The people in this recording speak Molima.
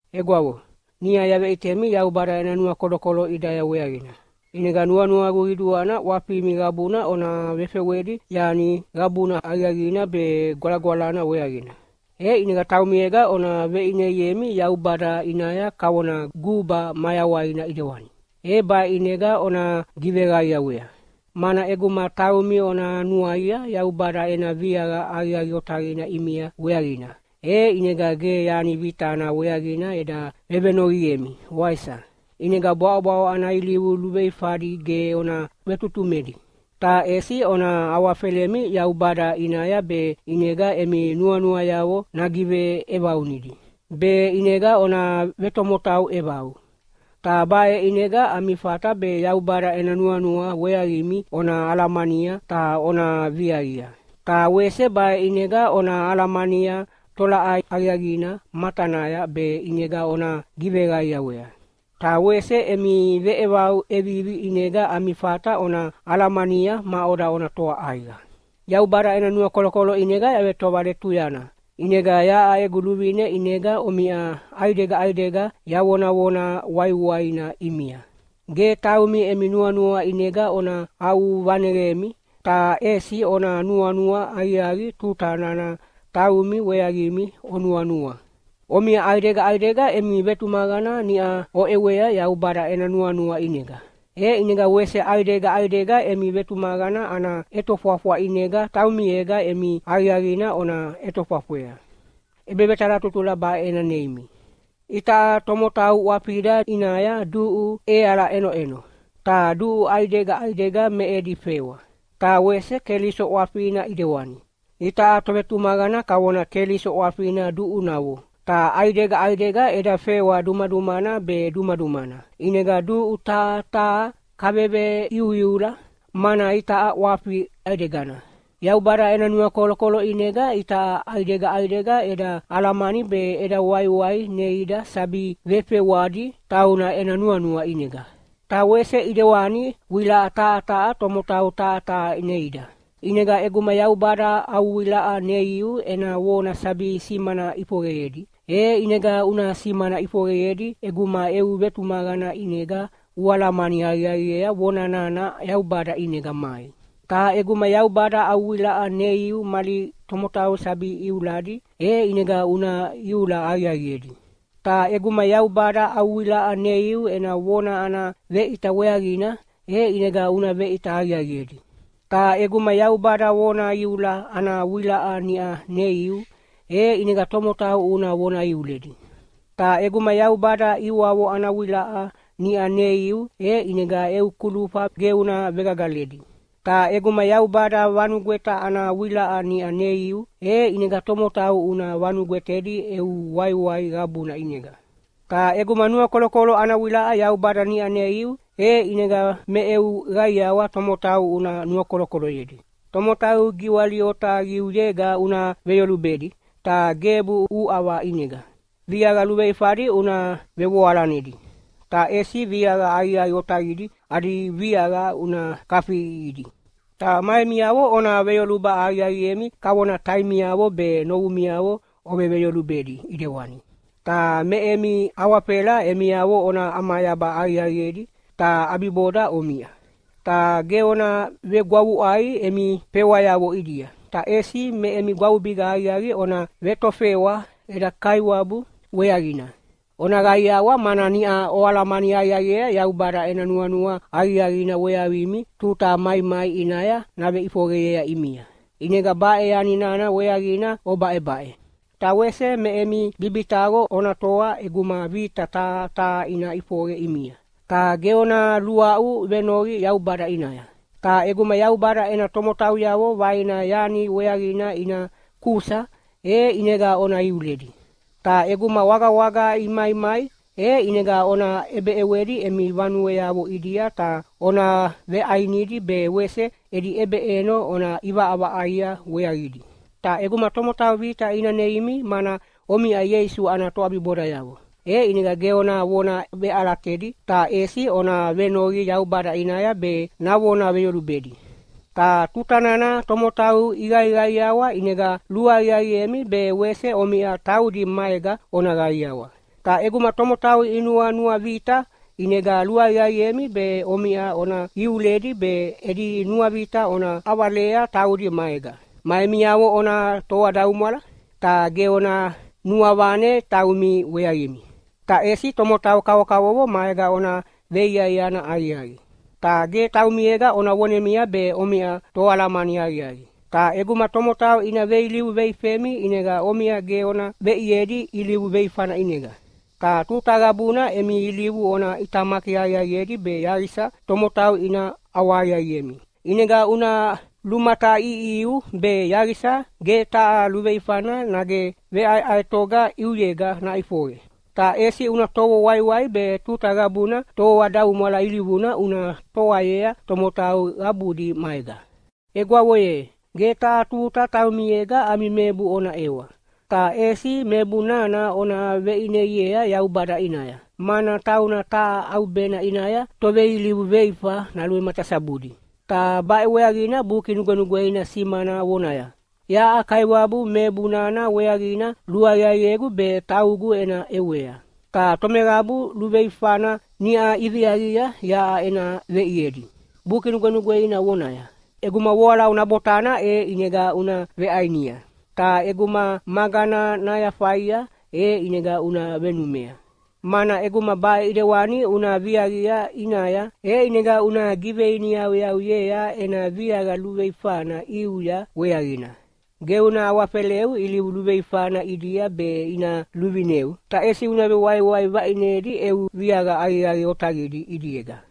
Egwavo, niʼa yaveʼitemi Yaubada ena nuakolokolo ʼidaya weaqina, ʼinega nuanuagu qiduana ʼwafimi qabuna ona vefewedi yani qabuna aqiaqina be gwalagwalana weaqina. E ʼinega taumiega ona veʼineiemi Yaubada ʼinaya kavona guba mayawaina ʼidewani, e baʼe ʼinega ona giveqaiawea. Mana ʼeguma taumi ona nuaia Yaubada ena viaqa aqiaqi otaqina ʼimia weaqina, e ʼinega ge yani vitana weaqina eda vevenoqiemi, waisa? ʼInega bwaʼobwaʼo ana ilivu luveifadi ge ona vetutumedi! Ta ʼesi ona awafelemi Yaubada ʼinaya be ʼinega emi nuanuayavo nagiveʼevaunidi, be ʼinega ona vetomotau ʼevau. Ta baʼe ʼinega ami fata be Yaubada ena nuanua weaqimi ona alamania ta ona viaqia. Ta wese baʼe ʼinega ona alamania tolaʼai aqiaqina matanaya be ʼinega ona giveqaiawea. Ta wese emi veʼevau ʼevivi ʼinega ami fata ona alamania maʼoda ona toa ʼaiqa. Yaubada ena nuakolokolo ʼinega yavetovaletuyana, ʼinega yaʼa egu luvine ʼinega omiʼa ʼaidega ʼaidega yavonavona waiwaina ʼimia: Ge taumi emi nuanua ʼinega ona aʼuvaneqemi, ta ʼesi ona nuanua aqiaqi tuta nana taumi weaqimi onuanua. Omiʼa ʼaidega ʼaidega emi vetumaqana niʼa oʼewea Yaubada ena nuanua ʼinega, e ʼinega wese ʼaidega ʼaidega emi vetumaqana ana ʼetofwafwa ʼinega taumiega emi aqiaqina ona ʼetofwafwea. ʼEbevetalatutula baʼe ena neimi: Itaʼa tomotau ʼwafida ʼinaya duʼu ʼeala iʼenoʼeno, ta duʼu ʼaidega ʼaidega me edi fewa. Ta wese Keliso ʼwafina ʼidewani. Itaʼa tovetumaqana kavona Keliso ʼwafina duʼunavo, ta ʼaidega ʼaidega eda fewa dumadumana be dumadumana, ʼinega duʼu taha taha kaveveiuiula, mana itaʼa ʼwafi ʼaidegana. Yaubada ena nuakolokolo ʼinega itaʼa ʼaidega ʼaidega eda alamani be eda waiwai neida sabi vefewadi tauna ena nuanua ʼinega. Ta wese ʼidewani wilaʼa taha taha tomotau taha taha neida. ʼInega ʼeguma Yaubada au wilaʼa neiu ena vona sabi simana ʼifoqeyedi, e ʼinega una simana ʼifoqeyedi ʼeguma eu vetumaqana ʼinega ualamani aqiaqiea vona nana Yaubada ʼinega mai. Ta ʼeguma Yaubada au wilaʼa neiu mali tomotau sabi iuladi, e ʼinega una iula aqiaqiedi. Ta ʼeguma Yaubada au wilaʼa neiu ena vona ana veʼita weaqina, e ʼinega una veʼita aqiaqiedi. Ta ʼeguma Yaubada vona iula ana wilaʼa niʼa neiu, e ʼinega tomotau una vona iuledi. Ta ʼeguma Yaubada ʼiwavo ana wilaʼa niʼa neiu, e ʼinega eu kulufa ge una vegagaledi. Ta ʼeguma Yaubada vanugweta ana wilaʼa niʼa neiu, e ʼinega tomotau una vanugwetedi eu waiwai qabuna ʼinega. Ta ʼeguma nuakolokolo ana wilaʼa Yaubada niʼa neiu, e ʼinega me eu qaiawa tomotau una nuakolokoloyedi. Tomotau giwali otaqiuyega una veyolubedi, ta gebu uʼava ʼinega. Viaqa luveifadi una vevoalanedi, ta ʼesi viaqa aqiaqi otaqidi adi viaqa una kafiʼiʼihidi. Ta ma emiavo ona veyoluba aqiaqiemi kavona taimiavo be novumiavo oveveyolubedi ʼidewani. Ta me emi awafela emiavo ona ʼamayaba aqiaqiedi, ta ʼabiboda omiʼa. Ta ge ona vegwavuʼai emi fewayavo ʼidia, ta ʼesi me emi gwavubiga aqiaqi ona vetofewa eda Kaiwabu weaqina. Ona qaiawa, mana niʼa oalamani aqiaqiea Yaubada ena nuanua aqiaqina weaqimi tuta maimai ʼinaya naveʼifoqeyea ʼimia, ʼinega baʼe yani nana weaqina obaʼebaʼe. Ta wese me emi bibitaqo ona toa ʼeguma vita taha taha ina ʼifoqe ʼimia, ta ge ona luaʼu venoqi Yaubada ʼinaya. Ta ʼeguma Yaubada ena tomotauyavo vaina yani weaqina ina kusa, e ʼinega ona iuledi. Ta ʼeguma wagawaga imaimai, e ʼinega ona ʼebeʼewedi emi vanueavo ʼidia ta ona veʼainidi be wese edi ʼebeʼeno ona ʼivaʼavaʼaia weaqidi. Ta ʼeguma tomotau vita ina neimi mana omiʼa Ieisu ana toʼabibodayavo, e ʼinega ge ona vona veʼalatedi, ta ʼesi ona venoqi Yaubada ʼinaya be navona veyolubedi. Ta tuta nana tomotau iqaiqaiawa ʼinega luaqiaqiemi be wese omiʼa taudi maega ona qaiawa. Ta ʼeguma tomotau inuanuavita, ʼinega luaqiaqiemi be omiʼa ona iuledi be edi nuavita ona ʼavalea taudi maega. Ma emiavo ona toadaumwala. Ta ge ona nuavane taumi weaqimi, ta ʼesi tomotau kavokavovo maega ona veiaiana aqiaqi. Ta ge taumiega ona vonemia be omiʼa toalamani aqiaqi. Ta ʼeguma tomotau ina veilivu veifemi ʼinega omiʼa ge ona veʼiedi ilivu veifana ʼinega. Ta tuta qabuna emi ilivu ona ʼitamaki aqiaqiedi be yaqisa tomotau ina ʼawahaqiaqiemi. ʼInega una lumataʼiʼihiu be yaqisa ge taha luveifana nage veʼaeʼaetoga ʼiuyega naʼifoqe, ta ʼesi una tovo waiwai be tuta qabuna toadaumwala ilivuna una toayea tomotau qabudi maega. Egwavo ye, ge taha tuta taumiega ami mebu ona ʼewa, ta ʼesi mebu nana ona veʼineiea Yaubada ʼinaya, mana tauna taha ʼaubena ʼinaya toveilivu veifa naluvematasabudi. Ta baʼe weaqina Buki Nugwenugweina simana vonaya, “Yaʼa Kaiwabu mebu nana weaqina luaqiaqiegu be taugu ena ʼewea. Ta tomeqabu luveifana niʼa iviaqia yaʼa ena veʼiedi.” Buki Nugwenugweina vonaya, “ʼEguma voalau nabotana e ʼinega una veʼainia, ta ʼeguma magana nayafaia e ʼinega una venumea. Mana ʼeguma baʼe ʼidewani una viaqia ʼinaya, e ʼinega una giveiniyauyauyea ena viaqa luveifana ʼiuya weaqina.” Ge una awafeleu ilivu luveifana ʼidia be ina luvineu, ta ʼesi una vewaiwai vaʼinedi eu viaqa aqiaqi otaqidi ʼidiega.